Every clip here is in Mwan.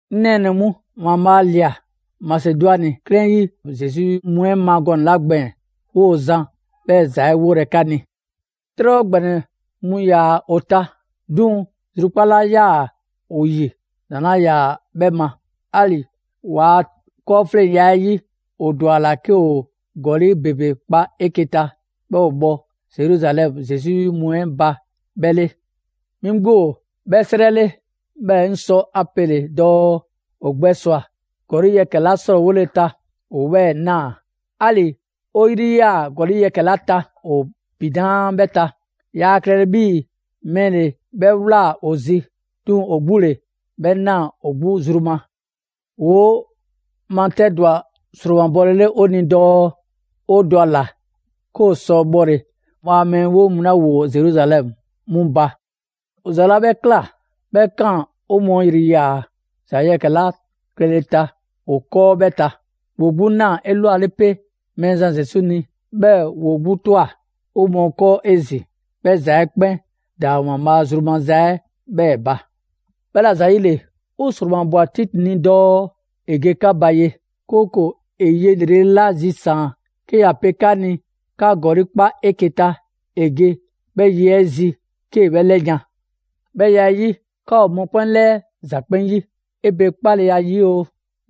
'Ŋ nɛɛnɛ‑ mu, ‑Waanbhaa' ꞊lia Masedwani 'klɛɛn 'yi Zesu 'yi mu 'ɛ ma gɔnɛ‑ 'la gbɛɛn‑, 'woo‑ zan 'bhɛ ‑za 'ɛ 'wolɛ‑ 'ka ni. 'Trɛbhɔ ‑gbɛnɛ mu ‑yaa ‑o ta. 'Duŋ‑ zrukpaa' 'la 'yaa‑ ‑o ‑yi ‑daŋ' 'laa ‑yaa 'bhɛ ma. 'Ali‑ ‑waa' 'kɔɔfleŋya 'ɛ 'yi, ‑o ‑dwa ‑a ‑la 'ke ‑o ‑gɔli' ‑bebe kpa 'eke‑ ta, 'bhɛɛ‑ ‑o bhɔ Zeruzalɛmu Zesu 'yi mu 'ɛ ba 'bhɛ 'le. 'Mi 'gbu ‑o 'bhɛ 'srɛ 'le, 'bhɛɛ‑ 'ŋ sɔ ‑a pele dɔɔ ‑o gbɛ ‑swa ‑gɔli' yɛkɛ‑ 'la 'srɔɔwole ta, ‑o 'bhɛɛ‑ ꞊naa. 'Ali‑ 'o yri ‑yaa gɔli' yɛkɛ‑ 'la ta ‑o ‑pinaa' 'bhɛ ta. Yaa klɛlɛ 'bhii‑ mɛɛ ‑le 'bhɛ ꞊wlaa ‑o zi, 'duŋ‑ ‑o 'gbu ‑le 'bhɛ ꞊naa ‑o 'gbu zru ma. ‑Woo' matɛdwa ‑sromabɔlele 'o ni dɔɔ 'o ‑dwa ‑a ‑la 'ke ‑o sɔ bhɔle ‑Waanbhaa' a mɛɛ 'weŋ mu 'la ‑woo Zeruzalɛmu 'mu ba. ‑O ‑za 'la 'bhɛ ꞊kla, 'bhɛ 'kaan‑ 'o mɔɔ ‑yri ‑yaa ‑za yɛkɛ‑ 'la klɛle ta ‑o 'kɔɔ 'bhɛ ta: ‑woo 'gbu ꞊naa 'elwale 'pe Mɛɛzan Zesu ni, 'bhɛɛ‑ ‑woo 'gbu ꞊twa 'o mɔɔ 'kɔɔ 'ezin‑, 'bhɛ ‑za 'ɛ 'kpɛn ‑daa ‑Waanbhaa' zru maza 'ɛ 'bhɛɛ‑ ba. 'Bhɛla‑ ‑zayile, 'o ‑sromabwa Titi ni dɔɔ ‑e ge 'ka ba ye, 'kooko‑ ‑e ye ‑lrele' 'la zisaan‑ 'ke ‑ya pe 'ka ni 'ka ‑gɔli' 'kpa 'eke‑ ta, ‑e ge 'bhɛ ye 'ɛ zi 'kee‑ 'bhɛ 'lɛyan‑. 'Bhɛ ya 'ɛ 'yi, 'ka ‑o mɔkpɛn' 'lɛɛ ‑za 'kpɛn 'yi: 'e pe 'kpaleya 'yi oo,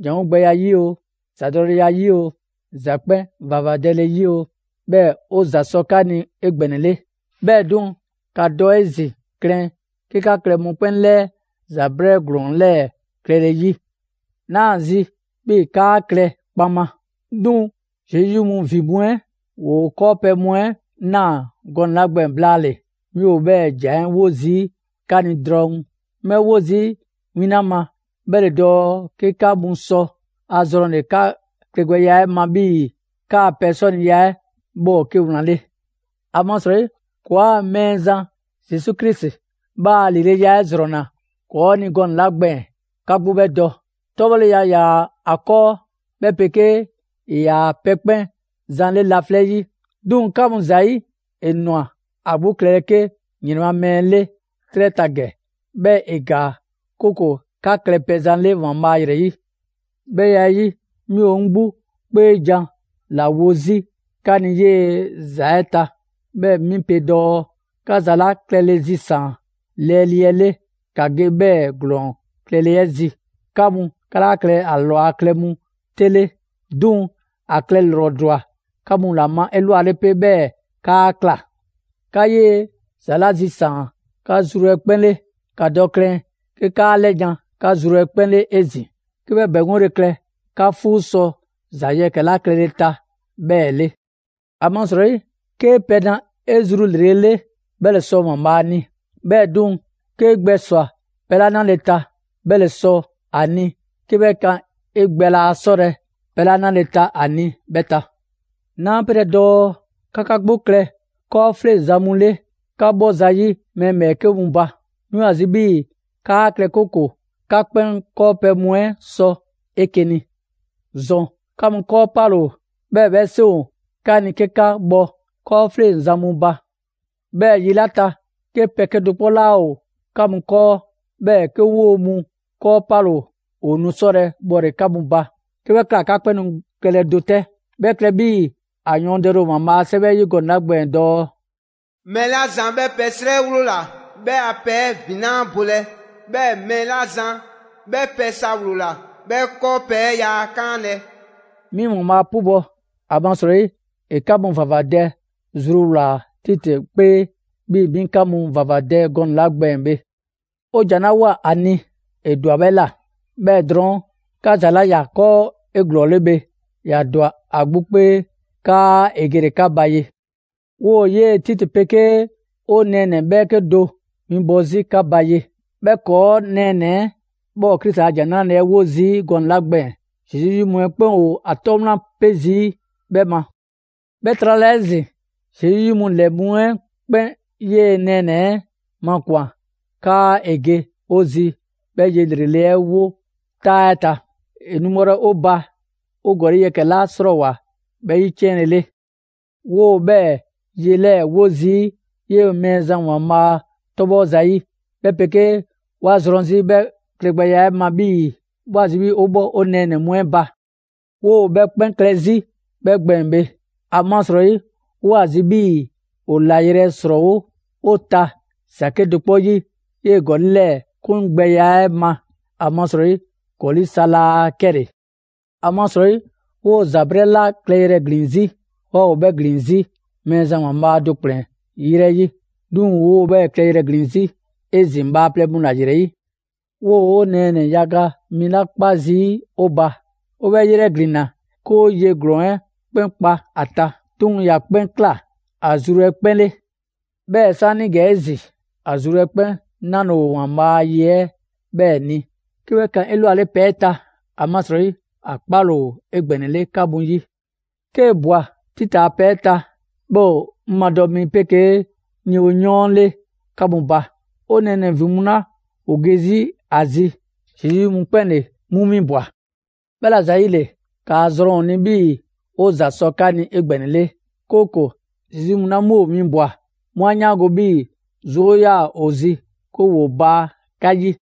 ‑janwo' gbɛya 'yi oo, ‑zadɔleya 'yi oo, ‑za 'kpɛn ‑vavadɛle 'yi oo; 'bhɛɛ‑ 'o ‑za sɔ 'ka ni 'egbɛnɛle. 'Bhɛɛ‑ 'duŋ‑, ‑ka dɔ 'ezin‑ klɛn 'ke 'ka klɛ mɔkpɛn' 'lɛɛ ‑za 'brɛɛ ‑glɔɔn 'lɛɛ‑ klɛle 'yi. 'Naa ‑a zi 'bhii‑ 'kaa klɛ kpaŋma. 'Duŋ‑ Zesu 'yi mu ‑vin mu 'ɛ ‑woo 'kɔɔpɛ‑ mu 'ɛ ꞊naa gɔnɛ‑ 'la gbɛɛn‑ blaale‑, 'mi ‑o 'bhɛɛ‑ ‑jan 'ɛ 'wo zii' 'ka ni drɔŋ. 'Ŋ 'bhɛ 'wo zii' win 'la ma, 'bhɛ ‑le dɔɔ 'ke 'ka mu sɔ a zrɔnle‑ 'ka klɛgbɛya 'ɛ ma 'bhii‑ 'kaa‑ pɛ 'sɔniya 'ɛ 'bhɛ ‑o 'ke wlan 'le. ‑Amasrɔyi ‑kɔɔa' Mɛɛzan Zesu Krisi 'bhɛ a ‑lileya 'ɛ ‑zrɔnna ‑kɔɔ' ni gɔnɛ‑ 'la gbɛɛn‑, 'ka 'gbu 'bhɛ dɔ. 'Tɔbhɔleya ‑yaa ‑a 'kɔɔ, 'bhɛ 'pegee ‑e ‑yaa' pɛ 'kpɛn zan 'le laflɛ' 'yi, 'duŋ‑ 'ka mu ‑zayi' ‑e ‑nwa ‑a 'gbu klɛlɛ 'ke ‑yrɛn ma mɛɛ 'le 'trɛ ta ‑gɛ, 'bhɛɛ‑ ‑e ‑gaa, 'kooko‑ 'ka klɛ pɛzan 'le ‑Waanbhaa' ‑yrɛ 'yi. 'Bhɛ ya 'ɛ 'yi bhe, 'mi ‑o 'ŋ 'gbu 'kpeejan‑ ‑la wo zii' 'ka ni 'yee‑ ‑za 'ɛ ta; 'bhɛɛ‑ 'mi pe dɔɔ: 'Ka ‑za 'la klɛle zisaan‑ lɛɛlii 'ɛ 'le, ‑ka ge 'bhɛɛ‑ ‑glɔɔn klɛle 'ɛ zi. 'Ka mu, 'ka laa klɛlɛ ‑a ꞊lwa klɛ mu 'te 'le, 'duŋ‑ ‑a klɛ ‑lrɔ ‑dwa 'ka mu 'la ma 'elwale 'pe, 'bhɛɛ‑ 'kaa ꞊kla. 'Ka 'yee‑ ‑za 'la zisaan‑ 'ka zru 'ɛ 'kpɛn 'le, ‑ka dɔ klɛn 'ke 'kaa 'lɛyan‑ 'ka zru 'ɛ 'kpɛn 'le 'ezin‑, 'ke 'bhɛ ‑bɛŋgole klɛ 'ka 'fuu sɔ ‑za yɛkɛ‑ 'la klɛle ta 'bhɛɛ‑ 'le. ‑Amasrɔyi, 'kee‑ pɛ na 'e zru ‑lrele' 'le, 'bhɛ ‑le sɔ ‑Waanbhaa' ni. 'Bhɛɛ‑ 'duŋ‑, 'kee gbɛswa‑ pɛ 'la 'nale‑ ta, 'bhɛ ‑le sɔ ‑a ni 'ke 'bhɛ kan 'e gbɛ laa 'sɔlɛ‑ pɛ 'la 'nale‑ ta a ni 'bhɛ ta. 'Naa 'pelɛ‑ dɔɔ 'ka 'ka 'gbu klɛ 'kɔɔfleŋzan mu 'le 'ka 'bhɔ zayi' mɛɛ ‑bhɛɛke' mu ba. 'Mi ‑o ‑a zi 'bhii‑ 'kaa klɛ, 'kooko‑ 'ka 'kpɛn 'kɔɔpɛ‑ mu 'ɛ sɔ 'eke‑ ni. ‑Zɔn 'ka mu 'kɔɔ 'pale‑ ‑o, 'bhɛɛ‑ 'bhɛ 'seŋ ‑o 'ka ni 'ke 'ka bhɔ 'kɔɔfleŋzan mu ba. 'Bhɛɛ‑ yi 'la ta, 'ke pɛ 'kedo‑ 'kpɔ 'laa ‑o 'ka mu 'kɔɔ, 'bhɛɛ‑ 'ke 'woo‑ mu 'kɔɔ 'pale‑ ‑o, ‑o nu 'sɔlɛ‑ bhɔle‑ 'ka mu ba. 'Ke 'bhɛ ꞊kla, 'ka 'kpɛn nu klɛlɛ do 'tɛ. 'Bhɛ klɛ 'bhii‑ ‑a yɔɔndɛle ‑o ‑Waanbhaa' a 'Sɛwɛ 'ɛ 'yi gɔnɛ‑ 'la gbɛɛn‑ dɔɔ: «Mɛɛ 'la zan 'bhɛ pɛ 'srɛ 'wloola‑, 'bhɛ a pɛ 'ɛ ‑vin 'laa bolɛ; 'bhɛɛ‑ mɛɛ 'la zan 'bhɛ pɛ sa ‑wloola, 'bhɛ 'kɔɔpɛ‑ 'ɛ yaa 'kaanlɛ‑.» 'Mi ‑Waanbhaa' 'pubɔ‑, ‑amasrɔyi ‑e 'ka mu ‑vavadɛ zruwlaa‑ Titi 'kpee 'bhii‑ 'mi 'ka mu ‑vavadɛ gɔnɛ‑ 'la gbɛɛn‑ bhe. 'O ‑jan 'la ꞊woa ‑a ni, ‑e ‑dwa 'bhɛ ꞊la. 'Bhɛɛ‑ drɔɔn', 'ka ‑za 'la ‑ya 'kɔɔ 'eglɔɔle bhe, ‑ya ‑dwa ‑a 'gbu 'kpee 'kaa ‑e gele‑ 'ka ba ye. 'Woo‑ 'yee‑ Titi 'pegee 'o nɛɛnɛ‑ 'bhɛɛke do winbɔ 'zi 'ka ba ye. 'Bhɛ ‑kɔɔ' nɛɛnɛ‑ 'ɛ 'bhɛ ‑o Krisi a ‑Jan 'Nrale‑ 'ɛ 'wo zii' gɔnɛ‑ 'la gbɛɛn‑, Zesu 'yi mu 'ɛ 'kpɛn ‑o ‑a 'tɔ wlan 'pe 'zi 'bhɛ ma. 'Bhɛ trala 'ezin‑, Zesu 'yi mu ‑lɛ mu 'ɛ 'kpɛn 'yee‑ 'o nɛɛnɛ‑ 'ɛ makwan‑ 'kaa ‑e ge 'o zi 'bhɛ ye ‑lrele' 'ɛ wo 'taa 'ɛ ta. ‑E nu bhɔlɛ 'o ba 'o ‑gɔli' yɛkɛ‑ 'la 'srɔɔwoa‑ 'bhɛ 'yiciɛnlele. 'Woo‑ 'bhɛ ye 'lɛɛ‑ 'wo zii' 'yee‑ Mɛɛzan ‑Waanbhaa' 'tɔ 'bhɔ zayi'; 'bhɛ 'pegee 'wa zrɔn 'zi 'bhɛ klɛgbɛya 'ɛ ma 'bhii‑ 'woo‑ ‑a zi 'bhii‑ 'o 'bhɔ 'o nɛɛnɛ‑ mu 'ɛ ba. 'Woo‑ 'bhɛ 'kpɛn klɛ 'zi 'bhɛ gbɛɛn‑ bhe, ‑amasrɔyi 'waa ‑o ‑a zi 'bhii‑ ‑o ‑layrɛ' ‑srɔɔwo' 'o ta ‑za 'kedo‑ 'kpɔ 'yi 'yee‑ ‑gɔli' 'lɛɛ 'kungbɛya 'ɛ ma, ‑amasrɔyi ‑gɔli' sa laa 'kɛle‑. ‑Amasrɔyi 'woo‑ ‑za 'brɛɛ ‑la klɛyrɛ ‑glin 'zi, 'waa ‑o 'bhɛ ‑glin 'zi Mɛɛzan ‑Waanbhaa' do ‑kplɛn 'yrɛ 'yi, 'duŋ‑ 'woo‑ 'bhɛ klɛyrɛ ‑glin 'zi 'ezin‑ bhaaplɛŋ mu ‑la ‑yrɛ 'yi. 'Woo‑ 'o nɛɛnɛ‑ yaga mi 'la 'kpa zii' ‑o ba; 'o 'bhɛ 'yrɛglinna 'ke 'o ye ‑glɔɔn 'ɛ 'kpɛn kpa ‑a ta, 'duŋ‑ ‑ya 'kpɛn ꞊kla ‑a zru 'ɛ 'kpɛn 'le. 'Bhɛɛ‑ 'saanigɛ 'ezin‑, ‑a zru 'ɛ 'kpɛn 'nale‑ ‑o ‑Waanbhaa' a ye 'ɛ 'bhɛɛ‑ ni 'ke 'bhɛ kan 'elwale pɛ 'ɛ ta, ‑amasrɔyi ‑a 'kpale‑ ‑o 'egbɛnɛle 'ka mu 'yi. 'Kee‑ ꞊bwa Titi a pɛ 'ɛ ta, 'bhɛ ‑o 'ŋ 'madɔ‑ mi 'pegee 'ŋ yewoyɔɔn 'le 'ka mu ba. 'O nɛɛnɛ‑ ‑vin mu 'la 'mu ‑o ge 'zi 'a zi, Zesu 'yi mu 'ɛ 'kpɛn ‑le 'mu 'winbwa‑. 'Bhɛla‑ ‑zayile, ‑kaa zrɔn ‑o ni 'bhii‑ ‑o ‑za sɔ 'ka ni 'egbɛnɛle, 'kooko‑ Zesu 'yi mu 'la 'mu ‑o winbwa‑, 'mu 'a 'yaango‑ 'bhii‑ 'zoo 'yaa‑ 'o zi 'ke 'woo baa 'ka 'yi.